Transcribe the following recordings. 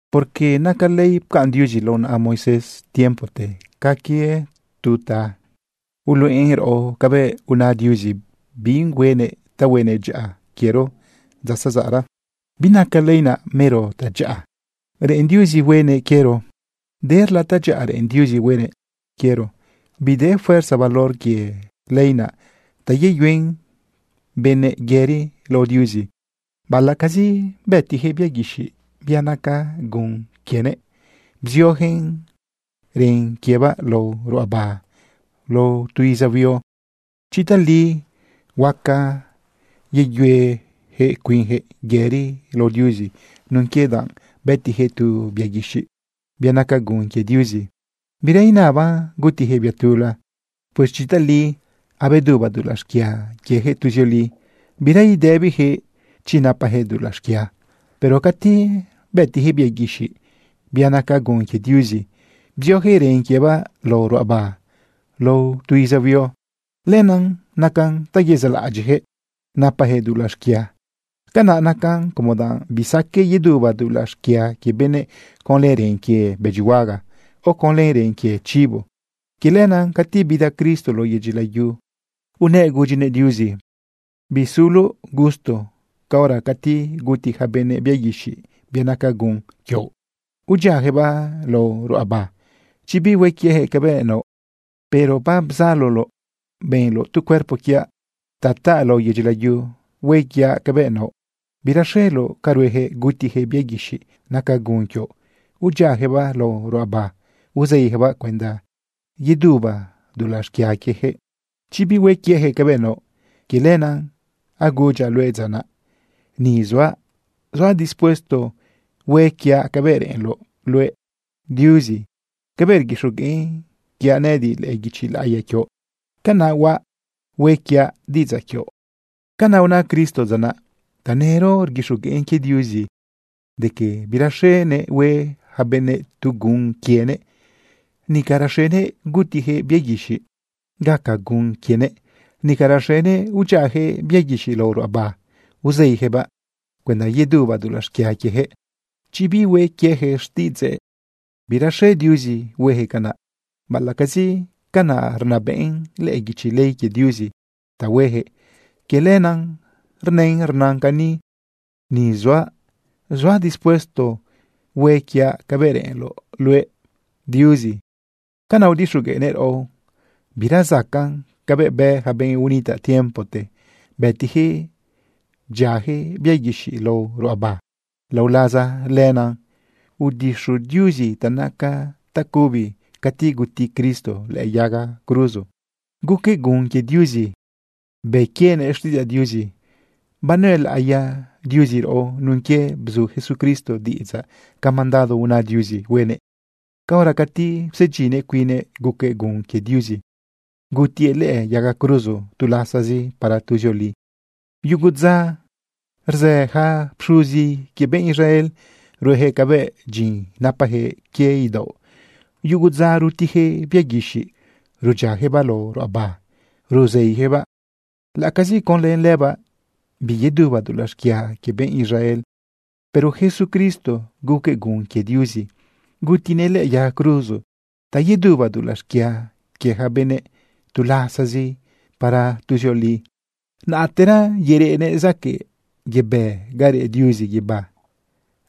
Porque naca ley pcaꞌn Diuzi lao naꞌa Moisés tiempote ca quie tu ta uluꞌen raꞌo cabëꞌ una Diuzi bi huenëꞌ ta huenëꞌ dyaꞌa quiero dza zazaꞌra. Binaca ley naꞌ mero tadyaꞌa reꞌen Diuzi huenëꞌ quiero. Derla tadyaꞌa reꞌen Diuzi huenëꞌ quiero. Bide fuerza valor quie ley naꞌ ta yeyuen benëꞌ yëri lao Diuzi, baꞌalaꞌcazi bëtijëꞌ bia guixiꞌ, bia naca gun quienëꞌ, bziojëꞌ ren quiebaꞌ lao ruꞌaba lao tu iza huio. Chi tali huaca yeyuejëꞌ cuinjëꞌ yëri lao Diuzi nun quie danꞌ bëtijëꞌ tu bia guixiꞌ, bia naca gun quie Diuzi, bira inaban gutijëꞌ bia tula. Pues chi tali abeduba dulaꞌ xquia quiejëꞌ tuzioli, bira idëbijëꞌ chi napajëꞌ dulaꞌ xquia. Pero cati bëtijëꞌ bia guixiꞌ, bia naca gun quie Diuzi, bziojëꞌ ren quiebaꞌ lao ruꞌaba lao tu iza huio, lenaꞌ nacan ta yezaꞌlaꞌadyiꞌjëꞌ napajëꞌ dulaꞌ xquia. Canaꞌ nacan como danꞌ bisaqueꞌ yeduba dulaꞌ xquia quie benëꞌ conlë ren quie bëdyihuaga, o conlë ren quie chibo. Quie lenaꞌ cati bida Cristo lao yedyi layu unëꞌ gudyinëꞌ Diuzi: Bisuloꞌ gusto caora cati guti ja benëꞌ bia guixiꞌ, bia naca gun quioꞌ, udyiajëꞌbaꞌ lao ruꞌaba, chi bihue quiejëꞌ cabëꞌ naoꞌ. Pero babzaloloꞌ benloꞌ tu cuerpo quiaꞌ ta taꞌ lao yedyi layu hue quiaꞌ cabëꞌ naoꞌ. Biraxeloꞌ ca ruejëꞌ gutijëꞌ bia guixiꞌ naca gun quioꞌ, udyiajëꞌbaꞌ lao ruꞌaba uzeijëꞌbaꞌ cuenda yeduba dulaꞌ xquia quiejëꞌ, chi bihue quieyaquëꞌ cabëꞌ naoꞌ. Quie lenaꞌ agudyaꞌ luëꞌ dza naꞌ: “Ni zuaꞌ, zuaꞌ dispuesto hue quiaꞌ cabëꞌ reꞌenloꞌ luëꞌ, Diuzi. Cabëꞌ rguixogueꞌn quiaꞌ nëꞌëdiꞌ lëꞌë guichi laꞌiya quioꞌ, canaꞌ huaꞌ, hue quiaꞌ diꞌidzaꞌ quioꞌ.” Canaꞌ una Cristo dza naꞌ. Tanëro rguixogueꞌn quie Diuzi de que biraxenëꞌ hueꞌ ja benëꞌ tu gun quienëꞌ, nica raxenëꞌ gutijëꞌ bia guixiꞌ gaca gun quienëꞌ, nica raxenëꞌ udyiajëꞌ bia guixiꞌ lao ruꞌaba uzeijëꞌbaꞌ cuenda yeduba dulaꞌ xquia quiejëꞌ, chi bihue quieyaquëꞌ xtiꞌidzëꞌ. Biraxe Diuzi huejëꞌ canaꞌ, baꞌalaꞌcazi canaꞌ rnabëꞌn lëꞌë guichi ley quie Diuzi ta huejëꞌ. Quie lenaꞌ rnën rnan cani: “Ni zuaꞌ, zuaꞌ dispuesto hue quiaꞌ cabëꞌ reꞌenloꞌ luëꞌ, Diuzi.” Canaꞌ udixogueꞌnëꞌ raꞌo bira zacaꞌn cabëꞌ bë ja benꞌ unitaꞌ tiempote bëtijëꞌ bdyiajëꞌ bia guixiꞌ lao ruꞌaba. Lao laza lenaꞌ udixu Diuzi ta naca tacubi cati guti Cristo lëꞌë yaga cruzo, guquëꞌ gun quie Diuzi, bë quienëꞌ xtiꞌidzaꞌ Diuzi. Banuelaꞌiya Diuzi raꞌo nun quie bzu Jesucristo diꞌidzaꞌ ca mandado una Diuzi huenëꞌ caora cati psedyinnëꞌ cuinnëꞌ, guquëꞌ gun quie Diuzi, gutiëꞌ lëꞌë yaga cruzo tu lasazi para tuzioli. Yugu dza rzë yaca pxuzi quie benꞌ Israel ruejëꞌ cabëꞌ dyin napajëꞌ quie idaoꞌ. Yugu dza rutijëꞌ bia guixiꞌ rudyiajëꞌbaꞌ lao ruꞌaba ruzeijëꞌbaꞌ, laꞌacazi conlë lëbaꞌ biyeduba dulaꞌ xquia quie benꞌ Israel. Pero Jesucristo guquëꞌ gun quie Diuzi gutinëꞌ lëꞌë yaga cruzo ta yeduba dulaꞌ xquia quie ja benëꞌ tu lasazi para tuzioli. Naꞌtera yereꞌnëꞌ zaquëꞌ yebë ga reꞌ Diuzi guibá.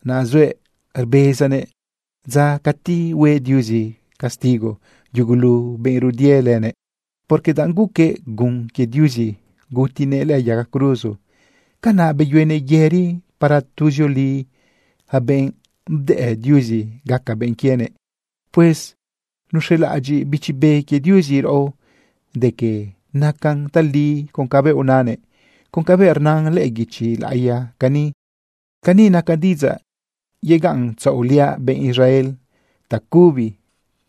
Naꞌ zuëꞌ rbezanëꞌ dza cati hue Diuzi castigo yugulu benꞌ rudie lëbëꞌ. Porque danꞌ guquëꞌ gun quie Diuzi, gutinëꞌ lëꞌë yaga cruzo, canaꞌ beyuenëꞌ yëri para tuzioli ja benꞌ bdëꞌ Diuzi gaca benꞌ quienëꞌ. Pues nuxelaꞌadyiꞌ Bichi Be quie Diuzi raꞌo de que nacan tali con cabëꞌ unanëꞌ, con cabëꞌ rnan lëꞌë guichi laꞌiya cani: Cani naca diꞌidzaꞌ yegaꞌntzaꞌoliaꞌ benꞌ Israel tacubi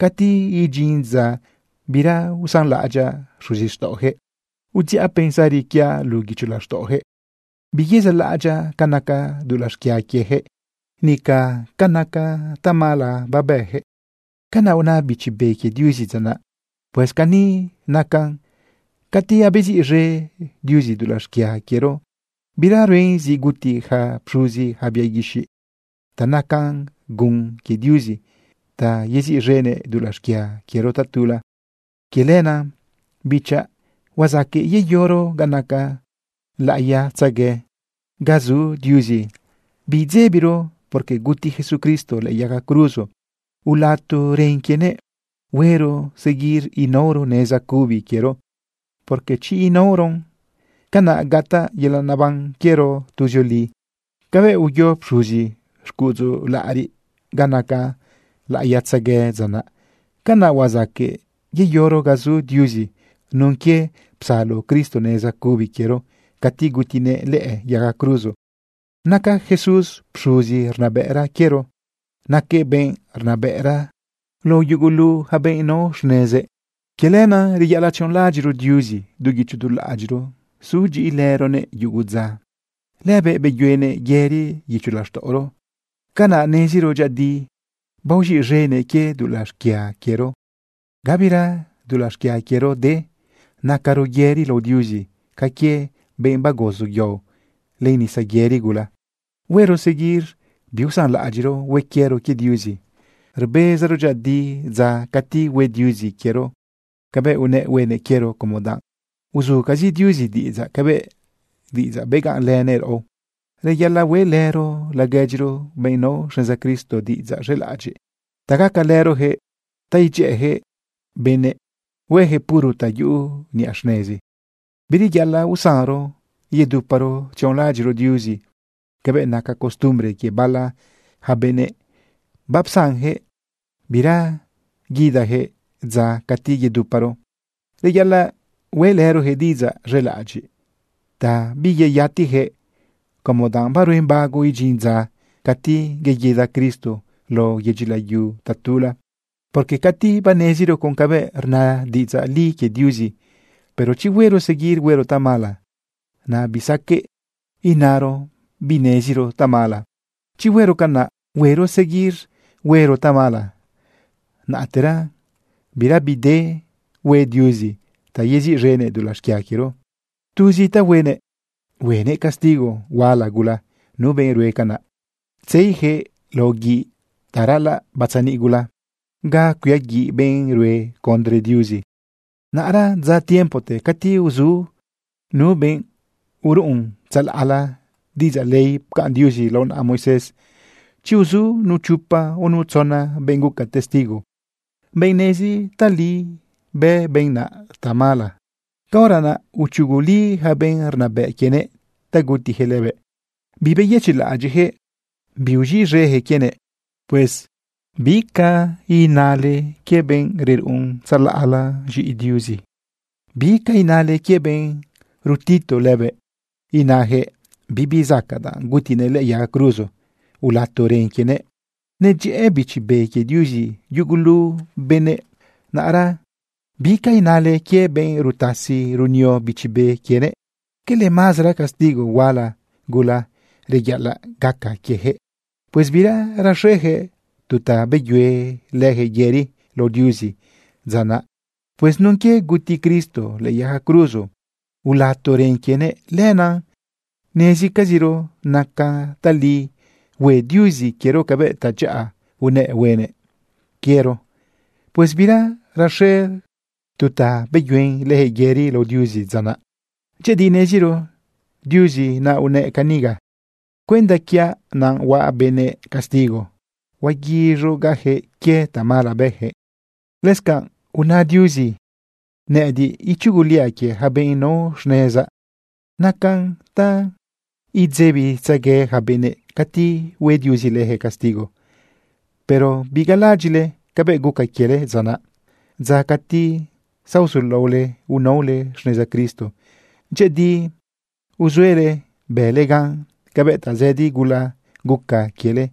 cati idyin dza bira usanlaꞌadyaꞌ xuzixtaꞌojëꞌ. Udziꞌa pensari quiaꞌ luꞌu guicho laxtaꞌojëꞌ. Biyezaꞌlaꞌ adyaꞌ ca naca dulaꞌ xquia quiejëꞌ, nica ca naca tamala babëjëꞌ. Canaꞌ una Bichi Be quie Diuzi dza naꞌ. Pues cani nacan: Cati abeziꞌz̃e Diuzi dulaꞌ xquia quiero, bira ruen zi guti ja pxuzi ja bia guixiꞌ ta naca gun quie Diuzi ta yeziꞌz̃enëꞌ dulaꞌ xquia quiero tatula. Quie lenaꞌ, bichaꞌ, huazaqueꞌ yeyoro ga naca laꞌiyatzegue ga zu Diuzi biidzebiro, porque guti Jesucristo lëꞌë yaga cruzo ulato ren quienëꞌ. Huero seguir inaoro neza cubi quiero, porque chi inaoron, canaꞌ gataꞌ yelaꞌ neban quiero tuzioli. Cabëꞌ uyo pxuzi xcuꞌudzu laꞌariꞌ ga naca laꞌiyatzegue dza naꞌ, canaꞌ huazaqueꞌ yeyoro ga zu Diuzi nun quie psalo Cristo neza cubi quiero cati gutinëꞌ lëꞌë yaga cruzo. Naca Jesús pxuzi rnabëꞌra quiero. Naquëꞌ benꞌ rnabëꞌra lao yugulu ja benꞌ nao xnezëꞌ. Quie lenaꞌ reyaꞌalaꞌ tzionlaꞌadyiꞌro Diuzi du guicho du laꞌadyiꞌro sudyiꞌilëroguëꞌ yugo dza. Lëbëꞌ beyuenëꞌ yëri guicho laxtaꞌoro. Canaꞌ neziro dyëꞌëdi baoz̃iꞌz̃enëꞌ quie dulaꞌ xquia quiero, gabira dulaꞌ xquia quiero de. Nacaro yëri lao Diuzi ca quie benꞌ bagozo yao len nisa yëri gula. Huero seguir biusanlaꞌadyiꞌro hue quiero quie Diuzi, rbezaro dyëꞌëdi dza cati hue Diuzi quiero cabëꞌ unëꞌ huenëꞌ quiero, como danꞌ uzucazi Diuzi diꞌidzaꞌ cabëꞌ diꞌidzaꞌ begaꞌnlënëꞌ raꞌo. Reyaꞌalaꞌ hueꞌlëro laguedyiro, benꞌ nao xneza Cristo, diꞌidzaꞌ z̃elaꞌadyiꞌ ta gacalërojëꞌ ta idyëꞌëjëꞌ benëꞌ huejëꞌ puro ta yuꞌu niꞌa xnezi. Bireyaꞌalaꞌ usanro yeduparo tzionlaꞌadyiꞌro Diuzi cabëꞌ naca costumbre quie bala ja benëꞌ, bapsanjëꞌ bira guidajëꞌ dza cati yeduparo. Reyaꞌalaꞌ hueꞌlërojëꞌ diꞌidzaꞌ z̃elaꞌadyiꞌ ta biyeyatijëꞌ como danꞌ baruen bago idyin dza cati yeguida Cristo lao yedyi layu tatula. Porque cati baneziro con cabëꞌ rna diꞌidzaꞌ li quie Diuzi, pero chi huero seguir huero tamala, naꞌ bisaqueꞌ inaro bineziro tamala. Chi huero canaꞌ, huero seguir huero tamala, naꞌtera bira bide bi hue Diuzi ta yeziꞌz̃enëꞌ dulaꞌ xquia quiero. Tuz ta huenëꞌ, huenëꞌ castigo huala gula nu benꞌ rue canaꞌ, tzeijëꞌ lao guiꞌ ta raꞌalaꞌ batzaniꞌ gula ga cuiaguiꞌ benꞌ rue condre Diuzi. Naꞌra dza tiempote cati uzu nu benꞌ uruꞌun tzalaꞌla diꞌidzaꞌ ley pcaꞌn Diuzi lao naꞌa Moisés, chi uzu nu chopa o nu tzona benꞌ guca testigo, benꞌ nezi tali bë benꞌ naꞌ tamala, caora naꞌ uchuguli yaca benꞌ rnabëꞌ quienëꞌ ta gutijëꞌ lëbëꞌ, bibeyëchiꞌlaꞌadyiꞌjëꞌ biuz̃iꞌz̃ejëꞌ quienëꞌ. Pues ¿bica inale quie benꞌ reruꞌun tzalaꞌla z̃iꞌi Diuzi? ¿Bica inale quie benꞌ rutitu lëbëꞌ inajëꞌ: “Bibi zacaꞌ danꞌ gutinëꞌ lëꞌë yaga cruzo ulato ren quienëꞌ”? Nedyëꞌë Bichi Be quie Diuzi yugulu benëꞌ, naꞌra ¿bica inale quie benꞌ rutasi runio Bichi Be quienëꞌ? ¿Quele mazara castigo huala gula reyaꞌalaꞌ gaca quiejëꞌ? Pues bira raxejëꞌ tu ta beyue lëjëꞌ yëri lao Diuzi dza naꞌ. Pues nun quie guti Cristo lëꞌë yaga cruzo ulato ren quienëꞌ, lenaꞌ nezcaziro nacan tali hue Diuzi quiero cabëꞌ tadyaꞌa unëꞌ huenëꞌ quiero. Pues bira raxejëꞌ tu ta beyuen lëjëꞌ yëri lao Diuzi dza naꞌ. Dyëꞌëdi neziro Diuzi naꞌ unëꞌ caniga: “Cuenda quiaꞌ naꞌ huaꞌ benëꞌ castigo. Huaguiz̃ugaꞌjëꞌ quie tamala bëjëꞌ.” Lëscanꞌ una Diuzi: “Nëꞌëdiꞌ ichuguliaꞌ quie yaca benꞌ nao xnezaꞌ.” Nacan ta idzebitzegue ja benëꞌ cati hue Diuzi lëjëꞌ castigo. Pero bigalaꞌadyiꞌle cabëꞌ guca quiele dza naꞌ, dza cati zaozulaole unaole xneza Cristo. Dyëꞌëdi uzuele bële gan cabëꞌ tazëdi gula guca quiele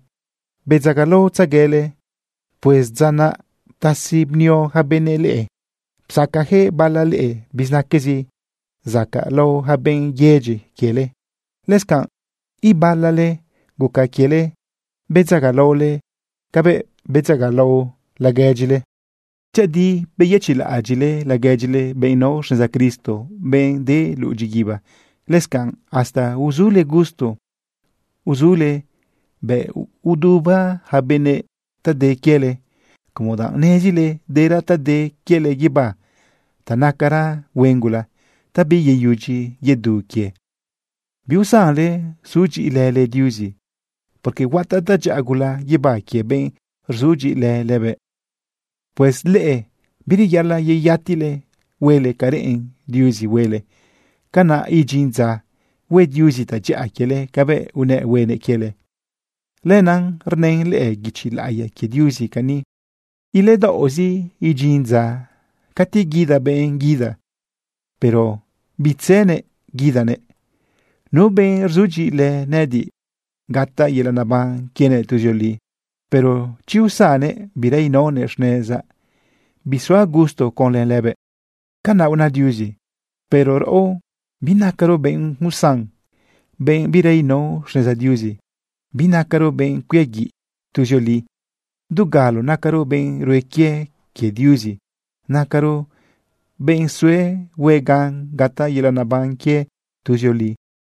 bedzagalaotzeguele. Pues dza naꞌ ptasi bnio ja benëꞌ leꞌe. Psacajëꞌ bala leꞌe bizinaquezi zacaꞌlao lao ja benꞌ yedyi quiele. Lëscanꞌ ibala leꞌe guca quiele bedzagalaole cabëꞌ bedzagalao laguedyile. Dyëꞌëdi beyëchiꞌlaꞌadyiꞌle laguedyile, benꞌ nao xneza Cristo, benꞌ de luꞌu dyiguiba. Lëscanꞌ hasta uzule gusto uzuele bëꞌ uduba ja benëꞌ ta de quiele, como danꞌ nezile dera ta de quiele guibá ta nacara huen gula ta biyeyudyi yedu quie. Biusanle sudyiꞌilële Diuzi, porque huataꞌ tadyaꞌa gula guibá quie benꞌ rzudyiꞌilë lëbëꞌ. Pues leꞌe bireyaꞌalaꞌ yeyatile huele ca reꞌen Diuzi huele. Canaꞌ idyin dza hue Diuzi tadyaꞌa quiele cabëꞌ unëꞌ huenëꞌ quiele. Lenaꞌ rnën lëꞌë guichi laꞌiya quie Diuzi cani: Iledaoꞌzi idyin dza cati guida benꞌ guida, pero bitzenëꞌ guidanëꞌ. Nu benꞌ rzudyiꞌilë nëꞌëdiꞌ, gataꞌ yelaꞌ neban quienëꞌ tuzioli. Pero chi usannëꞌ bira inaonëꞌ xnezaꞌ, bisuaꞌ gusto conlë lëbëꞌ. Canaꞌ una Diuzi. Pero raꞌo binacaro benꞌ usan, benꞌ bira inao xneza Diuzi. Binacaro benꞌ cuiaguiꞌ tuzioli. Dugalo nacaro benꞌ rue quie quie Diuzi. Nacaro benꞌ sue hue gan gataꞌ yelaꞌ neban quie tuzioli.